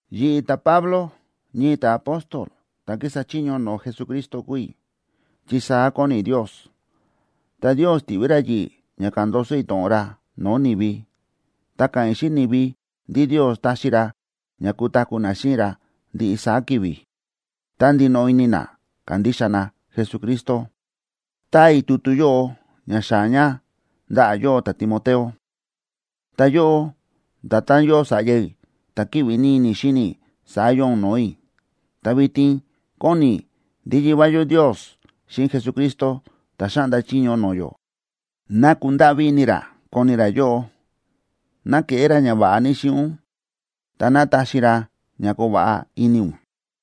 Yi̱ꞌi̱, ta̱Pablo, ñii ta̱apóstol ta̱ kísa chiño no̱o̱ Jesucristo kúu i̱, chi saá kóni Ndios. Ta Ndios ti̱ꞌví ra yi̱ꞌi̱ ña ka̱ꞌa̱n ndoso i̱ to̱ꞌon ra no̱o̱ ni̱vi. Ta káꞌa̱n i̱ xíꞌin ni̱vi ndí Ndios táxi ra ña kutaku̱ na xíꞌin ra ndiꞌi saá ki̱vi̱, tá ndinoꞌo ini na kándixa na Jesucristo. Táa i̱ tutu yóꞌo ña xaa̱ ña ndaꞌa̱ yóꞌó, ta̱Timoteo. Ta yóꞌó, nda̱tán yóo sa̱ꞌya i̱ ta̱ kíꞌvi ní ini i̱ xíni i̱, saá yóo ún no̱o̱ i̱. Ta vitin kóni i̱ ndí Yivá yó Ndios xíꞌin Jesucristo ta̱ xáꞌnda chiño no̱o̱ yó, ná kundáꞌví ini ra koni ra yóꞌó, ná keꞌé ra ñava̱ꞌa ní xíꞌin ún, ta ná taxi ra ña koo va̱ꞌa ini ún.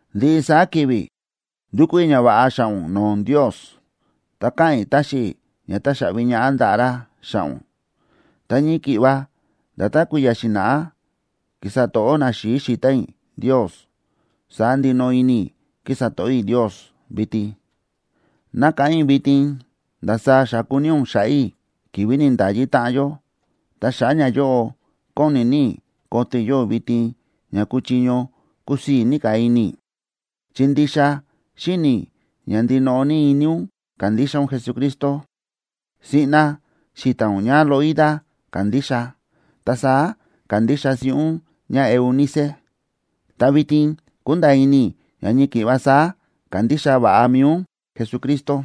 Ndiꞌi saá ki̱vi̱ ndúkú i̱ ñava̱ꞌa xa̱ꞌa̱ ún no̱o̱ Ndios, ta káꞌa̱n i̱ táxi i̱ ña taxaꞌvi ñaꞌá ndaꞌa̱ ra xa̱ꞌa̱ ún. Ta ñii ki̱ꞌva nda̱tán kui̱ya̱ xi̱na̱ꞌá ki̱sa to̱ꞌó naxi̱i̱ xi̱ta̱n i̱ Ndios, saá ndinoꞌo ini i̱ kísa to̱ꞌó i̱ Ndios vitin. Nákáꞌán i̱ vitin ndasaá xa̱ku ní ún xa̱ꞌa̱ i̱ ki̱vi̱ ni̱nda̱yi táꞌan yó, ta xa̱ꞌa̱ ñayóꞌo kóni ní i̱ koto i̱ yóꞌó vitin ña kuchiño kusii̱ ní ka̱ ini i̱. Chi ndixa xíni̱ i̱ ña ndinoꞌo ní ini ún kándixa ún Jesucristo. Siꞌna xi̱ta̱n ún ñáLoida ka̱ndixa, ta saá ka̱ndixa siꞌí ún ñáEunice, ta vitin kúnda̱a̱ ini i̱ ña ñii ki̱ꞌva saá kándixa va̱ꞌa mi̱i ún Jesucristo.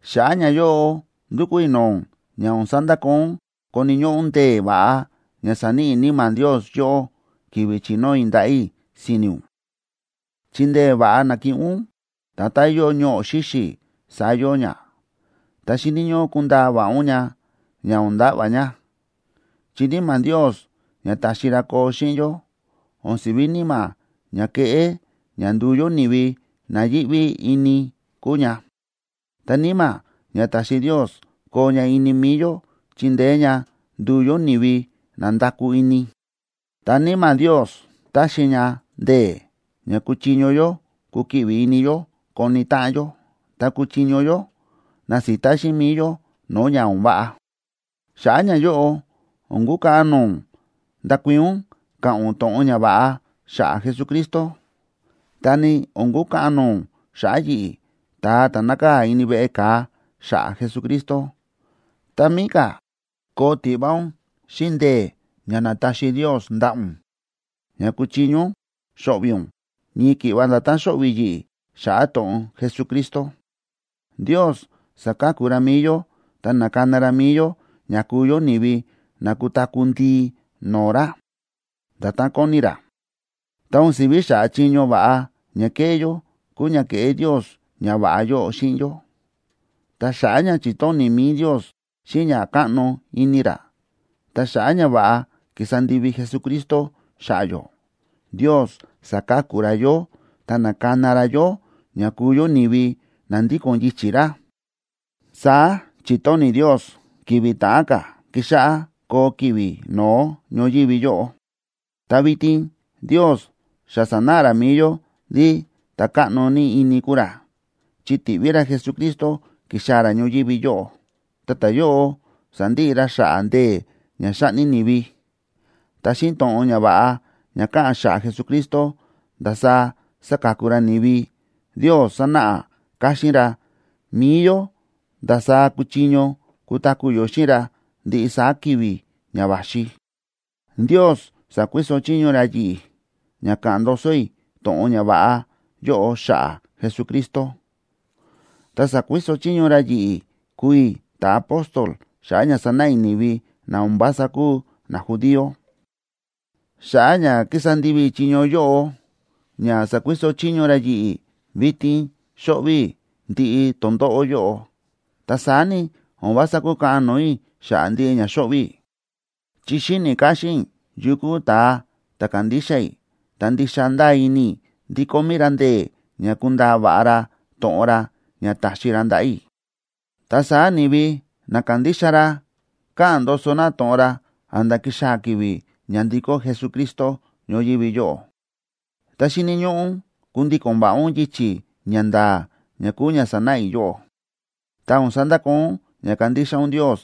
Xa̱ꞌa̱ ñayóꞌo ndúkú i̱ no̱o̱ ún ña o̱n sandakoo ún koni̱ ñóꞌó ún ndee̱ va̱ꞌa ña sa̱níꞌi Níma̱ Ndios yóꞌó ki̱vi̱ chi̱nóo i̱ ndaꞌa̱ i̱ si̱ni̱ ún, chi ndee̱ va̱ꞌa na̱kiꞌin ún, nda̱tán yóo ñoꞌo̱ xíxi̱, saá yóo ña, ta xíni̱ ñóꞌó kundaa va̱ꞌa ún ña, ña o̱n nda̱ꞌva̱ ña. Chi Níma̱ Ndios ña ta̱xi ra koo xíꞌin yó, o̱n siví níma̱ ña kéꞌé ña nduu yó ni̱vi na yíꞌví ini kúu ña, ta Níma̱ ña ta̱xi Ndios koo ña ini mi̱i yó chíndeé ña nduu yó ni̱vi na nda̱kú ini. Ta Níma̱ Ndios táxi ña ndee̱, ña kuchiño yó kukiꞌvi ini yó koni táꞌan yó, ta kuchiño yó nasita xíꞌin mi̱i yó no̱o̱ ña o̱n váꞌa. Xa̱ꞌa̱ ñayóꞌo, o̱n kukaꞌan no̱o̱ ún ndakuii̱n ún ka̱ꞌa̱n ún to̱ꞌon ñava̱ꞌa xa̱ꞌa̱ Jesucristo, ta ni o̱n kukaꞌan no̱o̱ ún xa̱ꞌa̱ yi̱ꞌi̱, ta̱a ta̱ nákaa̱ ini veꞌe ka̱a xa̱ꞌa̱ Jesucristo. Tá mií ka̱, koo tiꞌva ún xíꞌin ndee̱ ña nátaxi Ndios ndaꞌa̱ ún, ña kuchiño ún xo̱ꞌvi̱ ún, ñii ki̱ꞌva nda̱tán xóꞌvi̱ yi̱ꞌi̱ xa̱ꞌa̱ to̱ꞌon Jesucristo. Ndios sa̱ka̱ku ra mi̱i yó ta na̱kana ra mi̱i yó ña kuu yó ni̱vi na kutaku̱ ndii no̱o̱ ra, nda̱tán kóni ra. Ta o̱n si̱ví xa̱ꞌa̱ chiño va̱ꞌa ña ke̱ꞌé yó kúu ña ke̱ꞌé Ndios ñava̱ꞌa yóꞌo xíꞌin yó, ta xa̱ꞌa̱ ña chi̱tóni̱ mi̱i Ndios xíꞌin ña káꞌno ini ra, ta xa̱ꞌa̱ ñava̱ꞌa ki̱sa ndivi Jesucristo xa̱ꞌa̱ yó, Ndios sa̱ka̱ku ra yó ta na̱kana ra yó ña kúu yó ni̱vi na ndíko̱n yichi̱ ra. Saá chi̱tóni̱ Ndios ki̱vi̱ ta̱ꞌán ka̱ kixáꞌá koo ki̱vi̱ no̱ó ñoyívi yóꞌo. Ta vitin Ndios xa sa̱náꞌa ra mi̱i yó ndí ta̱ káꞌno ní ini kúu ra, chi ti̱ꞌví ra Jesucristo ki̱xaa̱ ra ñoyívi yóꞌo, ta ta̱yóꞌo sa̱ndiꞌi ra xa̱ꞌa̱ ndee̱ ña xáꞌni ni̱vi. Ta xíꞌin to̱ꞌon ñava̱ꞌa ña káꞌa̱n xa̱ꞌa̱ Jesucristo ndasaá sáka̱ku ra ni̱vi, Ndios sa̱náꞌa káxín ra mi̱i yó ndasaá kuchiño kutaku̱ yó xíꞌin ra ndiꞌi saá ki̱vi̱ ña va̱xi. Ndios sa̱kuiso chiño ra yi̱ꞌi̱ ña ka̱ꞌa̱n ndoso i̱ to̱ꞌon ñava̱ꞌa yóꞌo xa̱ꞌa̱ Jesucristo, ta sa̱kuiso chiño ra yi̱ꞌi̱ kúu i̱ ta̱apóstol xa̱ꞌa̱ ña sanáꞌa i̱ ni̱vi na o̱n vása kúu najudío. Xa̱ꞌa̱ ña kísa ndivi i̱ chiño yóꞌo ña sa̱kuiso chiño ra yi̱ꞌi̱, vitin xóꞌvi̱ i̱ ndiꞌi tondóꞌó yóꞌo. Ta saá ni, o̱n vása kúkaꞌan no̱o̱ i̱ xa̱ꞌa̱ ndiꞌi ña xóꞌvi̱ i̱, chi xíni̱ káxín i̱ yu kúu ta̱a ta̱ kándixa i̱, ta ndixa ndáa ini i̱ ndí kómí ra ndee̱ ña kundaa va̱ꞌa ra to̱ꞌon ra ña ta̱xi ra ndaꞌa̱ i̱, ta saá ni̱vi na kándixa ra ka̱ꞌa̱n ndoso na to̱ꞌon ra a̱nda̱ kixaa̱ ki̱vi̱ ña ndikó Jesucristo ñoyívi yóꞌo. Ta xíni̱ ñóꞌó ún kundíko̱n va̱ꞌa ún yichi̱ ña nda̱a̱ ña kúu ña sa̱náꞌa i̱ yóꞌó. Ta o̱n sandakoo ún ña kandixa ún Ndios,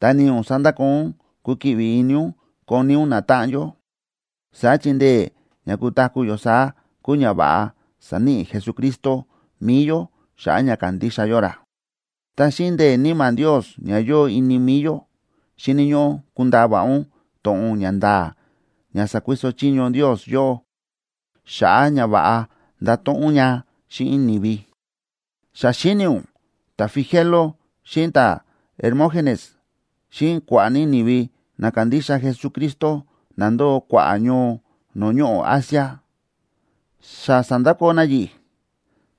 ta ni o̱n sandakoo ún kukiꞌvi ini ún koni ún natáꞌan yó, saá chi ndee̱ ña kutaku̱ yó saá kúu ñava̱ꞌa sa̱níꞌi Jesucristo mi̱i yó xa̱ꞌa̱ ña kándixa yó ra. Ta xíꞌin ndee̱ Níma̱ Ndios ña yóo ini mi̱i yó, xíni̱ ñóꞌó kundaa va̱ꞌa ún to̱ꞌon ña nda̱a̱ ña sa̱kuiso chiño Ndios yóꞌó xa̱ꞌa̱ ña va̱ꞌa ndato̱ꞌon ún ña xíꞌin ni̱vi. Xa xíni̱ ún ta̱Figelo xíꞌin ta̱Hermógenes xíꞌin kua̱ꞌa̱ ní ni̱vi na kándixa Jesucristo na ndóo kua̱ꞌa̱ ñoo no̱o̱ ñoꞌo̱ Asia, xa sa̱ndakoo na yi̱ꞌi̱,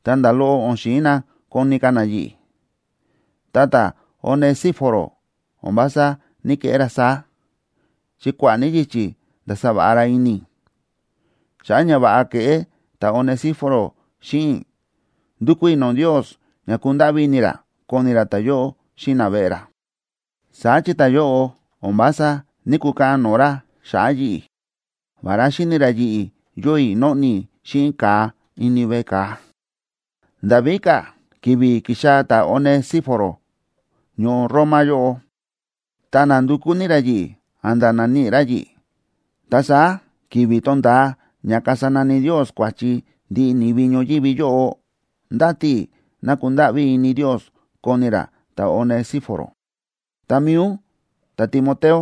ta nda̱ loꞌo o̱n xi̱in na koni ka̱ na yi̱ꞌi̱. Ta ta̱Onesíforo, o̱n vása ní‑keꞌé ra saá, chi kua̱ꞌa̱ ní yichi̱ nda̱sa va̱ꞌa ra ini i̱. Xa̱ꞌa̱ ñava̱ꞌa ke̱ꞌé ta̱Onesíforo xíꞌin i̱, ndúkú i̱ no̱o̱ Ndios ña kundáꞌví ini ra koni ra ta̱yóꞌo xíꞌin naveꞌe ra. Saá chi ta̱yóꞌo o̱n vása ní‑kukaꞌan no̱o̱ ra xa̱ꞌa̱ yi̱ꞌi̱, vará xi̱ni ra yi̱ꞌi̱ yóo i̱ nóꞌni i̱ xíꞌin ka̱a ini veꞌe ka̱a. Nda̱ víka̱, ki̱vi̱ ki̱xaa̱ ta̱Onesíforo ñoo Roma yóꞌo, ta na̱ndukú ní ra yi̱ꞌi̱ a̱nda̱ na̱níꞌi ra yi̱ꞌi̱. Ta saá, ki̱vi̱ tonda̱a ña kasa nani Ndios kua̱chi ndiꞌi ni̱vi ñoyívi yóꞌo, ndáti i̱ ná kundáꞌví ini Ndios koni ra ta̱Onesíforo. Ta mi̱i ún, ta̱Timoteo,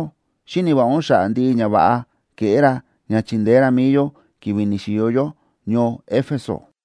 xíni̱ va̱ꞌa ún xa̱ꞌa̱ ndiꞌi ñava̱ꞌa ke̱ꞌé ra ña chi̱ndeé ra mi̱i yó ki̱vi̱ ni̱xi̱yo yó ñoo Éfeso.